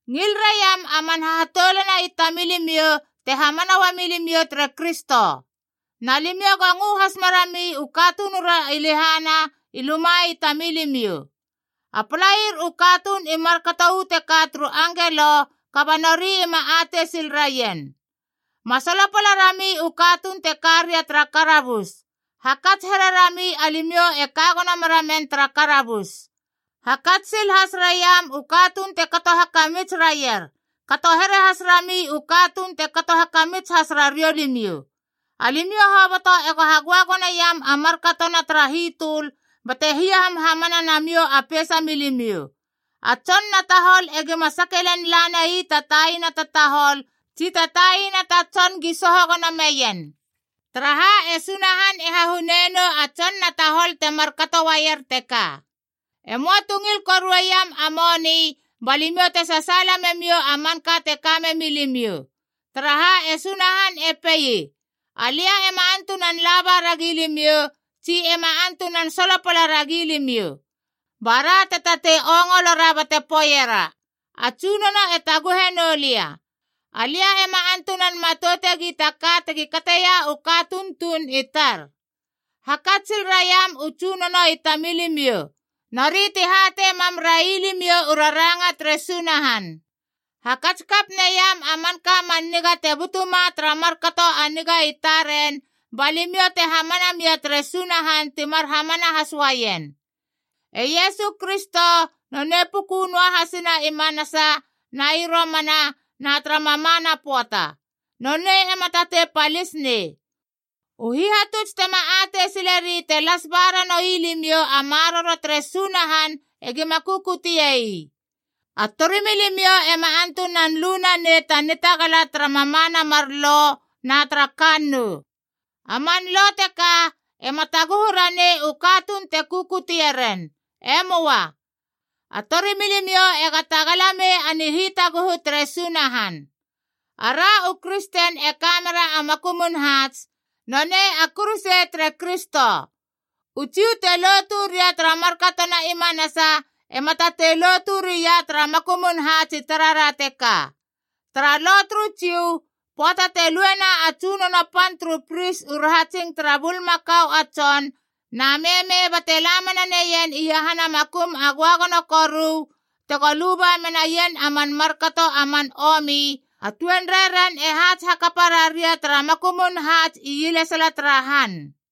Ngil raiam a man hahatoulana i tamilimiou te hamana uami limiou tere Kristo. Na limiou go ngö has merami u katunura i lehana i luma i tamilimiou. A palair u katuun i markato uu teka turu angelo, kaba nori ima atei sil raien. Ma solopala rami u katuun te ka ria tara karabus.a Hakats here rami alimiou e ka gono mera men tara karabus. Hakats sil has raiam u katuun te kato hakamits raier, kato here has rami u katuun e kato hakamits has rariou limiou. Alimiou hoboto ego hagöagoneiam a markatona tara hitöl bate hiahamhamana namiou a peisa milimiou. A tson na tahol egima sake lel lanai ta taina ta tahol tsi ta taina ta tson gi soho gono meien. Taraha e Sunahan e hahunei nou a tson na tahol temar kato uaier teka. E möa tu ngil korueiam a moni, ba limiou te sasaala memiou a manka te ka memi limiou. Taraha, e Sunahan e pei, “Alia ema antunan laba ragi limiou tsi ema antunan solopala ragi limiou.” Ba ra te tatei ongolora bate poeiera, “A Tsunono e taguhe noulia. Alia ema antunan matoutegi ta ka tegi kateia u katuun tuun i tar.” Hakats sil raiam u tsunono i tamilimiou, nori ti hatei mam railimiou u raranga tere Sunahan. Hakats kap naiam a manka man niga te butuma tara markato a niga i taren, ba limiou te hamana mia tere Sunahan timar hamana has uaien. E Iesu Kristo, nonei puku noahasina i manasa, na i romana na tara mamana pöata. Nonei ema tatei palis nei. U hihatuts tema atei sileri te las ba ranoui limiou a maroro tere Sunahan egima kukute ii. A torimilimiou ema antunan lu nanei ta nitagala tara mamana mar lo na tara kannou. A man lo teka ema taguhu ranei u katuun te kukutie ren. E möa. A tori milimiou ega tagala mei a nihitaguhu tere Sunahan. Ara u kristen e ka mera a makumun haats, nonei a kuruse tere Kristo. U Jiu te lotu ria tara markatona i manasa ema tatei lotu ria tara makumun haats i tarara teka. Tara Lo turu Jiu, pöata te luena a tsunono pan turu pris u rahatsing tara bulmakau a tson na meme bate la mena neien iahana Makum a Göagono Koru tego luba menaien a man markato a man omi, a tuenrei ren e haats hakapa raria tara makumun haats ielesala tara han.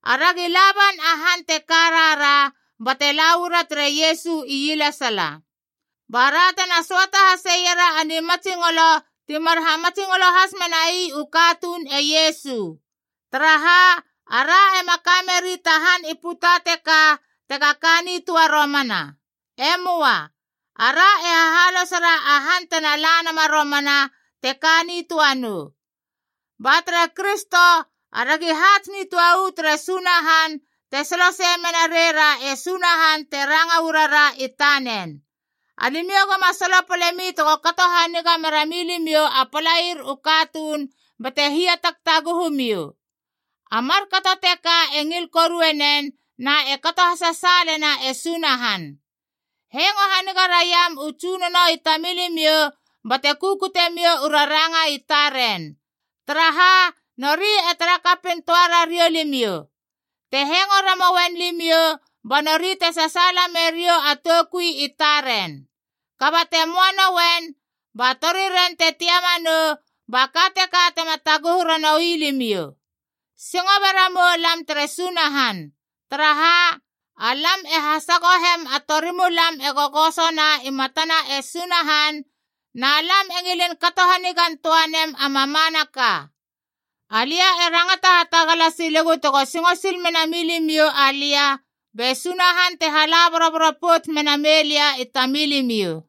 Aragi laban a han te ka rara bate la uara tere Iesu ielesala, bara tena söata haseiera a nimatsingolo timar hamatsingolo has menai u katuun e Iesu. Taraha, ara ema ka meri ta han i puta teka tega ka nitöa romana. E möa. Ara e hahalosera a han tena la nama romana, teka nitöa nou. Ba tere Kristo aragi haats nitöa uu tere Sunahan te solosei mena reira e Sunahan te ranga uarara i tanen.b Alimiou goma solopalemi tego kato haniga mera milimiou a palair u katuun bate hiatagtaguhu miou. A markato teka e ngil korue nen na e kato hasasaalena e Sunahan. Hengo haniga raiam u tsunono i tamilimiou, bate kukute miou u raranga i taren. Taraha, nori e tara kapin toa rariou limiou. Te hengo ramouen limiou, ba nori te sasaala meriou a toukui i taren. Kaba te möa nouen, ba toriren te tiama nou, ba ka teka tema taguhu ranoui limiou. Singo be ramu moulam tere Sunahan. Taraha, alam e hasagohem a torimulam e gogosona i matana e Sunahan, na lam e ngilin kato hanigantöa nem a mamanaka. Alia e rangata hatagala silegu tego singo sil mena limiou alia be Sunahan te hala boroboro pouts mena meilia i tamilimiou.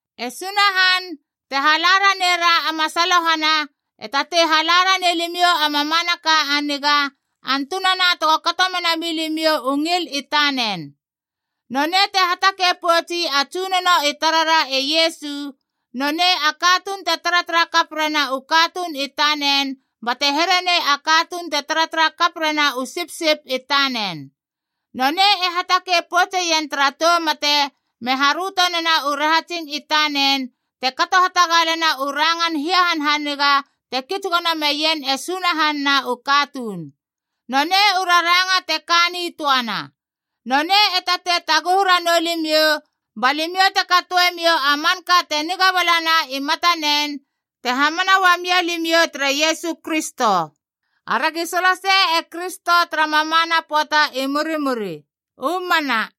E Sunahan, te hala ranei ra a masalohana, e tatei hala ranei limiou a mamanaka a niga, antunana tego kato mena milimiou u ngil i tanen. Nonei te hatakei poutsi a Tsunono i tarara e Iesu, nonei a katuun te taratara kap rena u katuun i tanen bate here nei a katuun te taratara kap rena u sipsip i tanen. Nonei e hatakei poutseien tara tou mate me haröto nena u rahatsing i tanen te kato hatagalena u rangan hiahanhaniga te kits gono meien e Sunahan na u katuun. Nonei u raranga te ka nitöana. Nonei e tatei taguhu ranou limiou ba limiou te katoemiou a manka te niga balana i matanen, te hamana uamia limiou tere Iesu Kristo. Aragi solosei e Kristo tara mamana pöata i murimuri. U mana.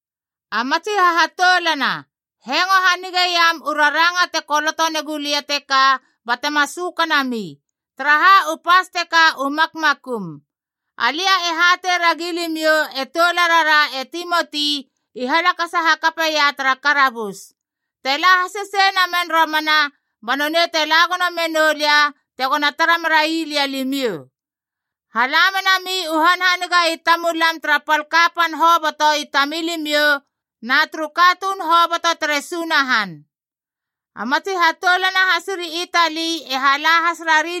A matsi hahatoulana, hengo hanigeiam u raranga te koloto negulia teka batema sökanami, taraha u pas teka u makmakum. Alia e hatei ragi limiou e toularara e Timoti i halakasa hakapeia tara karabus. Te la hasesei namen romana, ba nonei te la gono menou lia tegona tara merai lia limiou. Hala menami u hanhaniga i tamulam tara pal kapan hoboto i tamilimiou na turu katuun hoboto tere Sunahan. A matsi hatoulana hasiri Itali e hala has rari limiou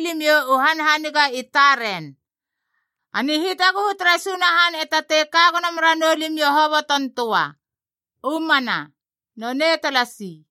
u hanhaniga i taren. A nihitaguhu tere Sunahan e tatei kagono meranou limiou hobotontöa. U mana. Nonei talasi.